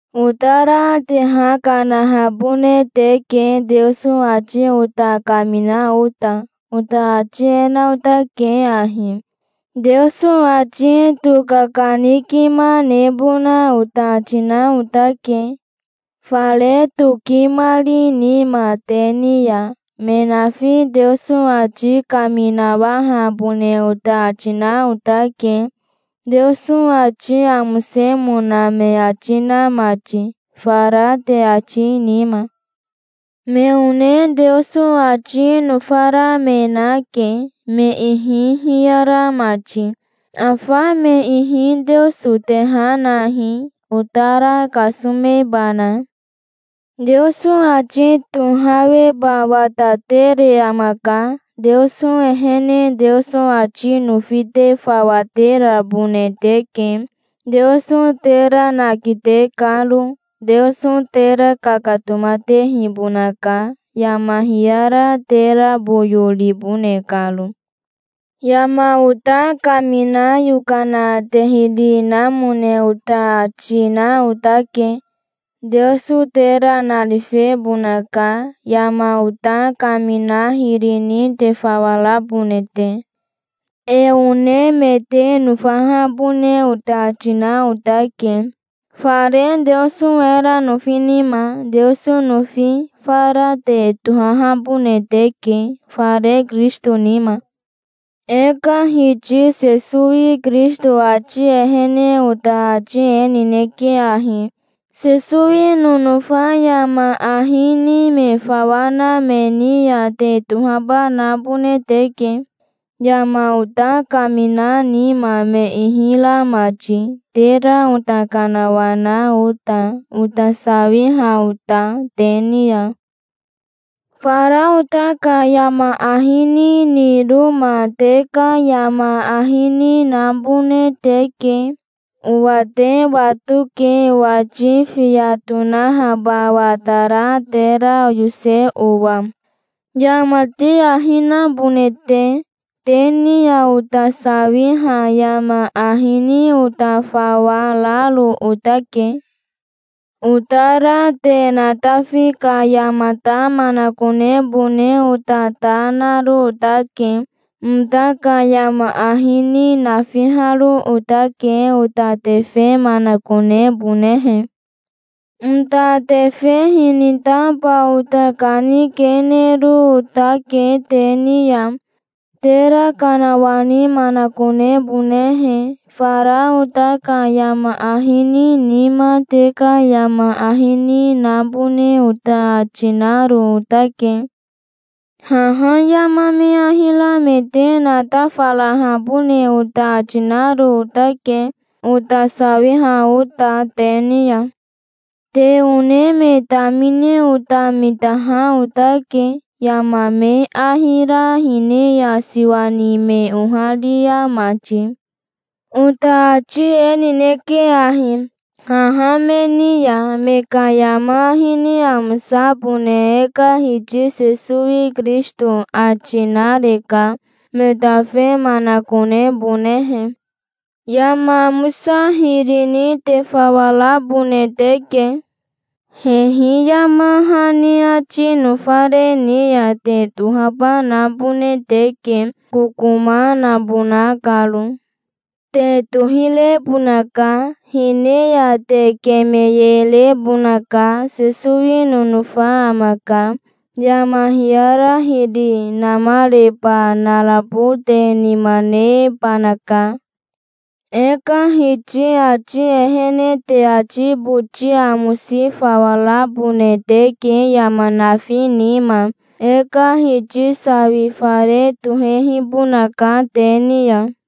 Otara te ha kanahabone teke, Teoso ati ota kamina ota. Ota ati e na otake ahi: Teoso ati tokakanikima nebona ota ati na otake, fare tokimari nima te ni ya. Me nafi Teoso ati kaminawahabone ota ati na otake, Teoso ati amosemona me ati na mati, fara te ati nima. Me one Teoso ati nofara me nake, me ihi hiyara mati. Afa me ihi Teoso te ha nahi, otara kasomebana. Teoso ati tohaweba watatere amaka. Teoso ehene Teoso ati nofi te fawa terabone teke, Teoso tera nakite karo. Teoso tera kakatomatehibonaka, yama hiyara tera boyo ribone karo. Yama ota kamina yokana te hiri namone ota ati na otake. Teoso tera narifebonaka, yama ota kamina hiri ni te fawa rabone te. E one me te nofahabone ota ati na otake, fare Teoso era nofi nima. Teoso nofi fara te tohahabone teke, fare Kirisito nima. E ka Hiti Sesowi Kirisito ati ehene ota ati e nineke ahi: Sesowi nonofa yama ahi ni me fawa na me ni ya te tohaba nabone teke, yama ota kamina nima me ihi ra mati, tera ota kanawana ota, ota sawiha ota te ni ya. Fara ota ka yama ahi ni niroma te ka yama ahi ni nabone teke. Owa te watoke owati fiya tonahaba watara tera oyose owa, yama te ahi nabone te. Te ni ya ota sawiha yama ahi ni ota fawa raro otake. Otara te natafi ka yamata manakonebone ota ta naro otake. Ota ka yama ahi ni nafiharo otake, ota tefe manakonebonehe. Ota tefe hinitaba ota kanikenero otake te ni ya, tera kanawani manakonebonehe. Fara ota ka yama ahi ni nima te ka yama ahi ni nabone ota ati naro otake. Haha yama me ahi ra me te natafarahabone ota ati naro otake, ota sawiha ota te ni ya. Te one me tamine ota mitaha otake, yama me ahi ra hine ya siwa ni me oharia mati. Ota ati e nineke ahi, haha me ni ya: me ka yama ahi ni amosabone e ka Hiti Sesowi Kirisito ati nareka, me tafe manakonebonehe. Yama amosa hiri ni te fawa rabone teke. Hehi yama hani ati nofare ni ya te tohaba nabone teke, kokoma nabona karo. Te tohirebonaka, hine ya te kemeyerebonaka. Sesowi nonofa amaka. Yama hiyara hiri namareba narabo te nima nebanaka. E ka Hiti ati ehene te ati boti amosi fawa rabone teke yama nafi nima. E ka Hiti sawi fare tohehibonaka te ni ya.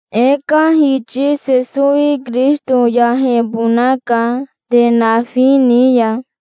E ka Hiti Sesowi Kirisito yahebonaka, te nafi ni ya.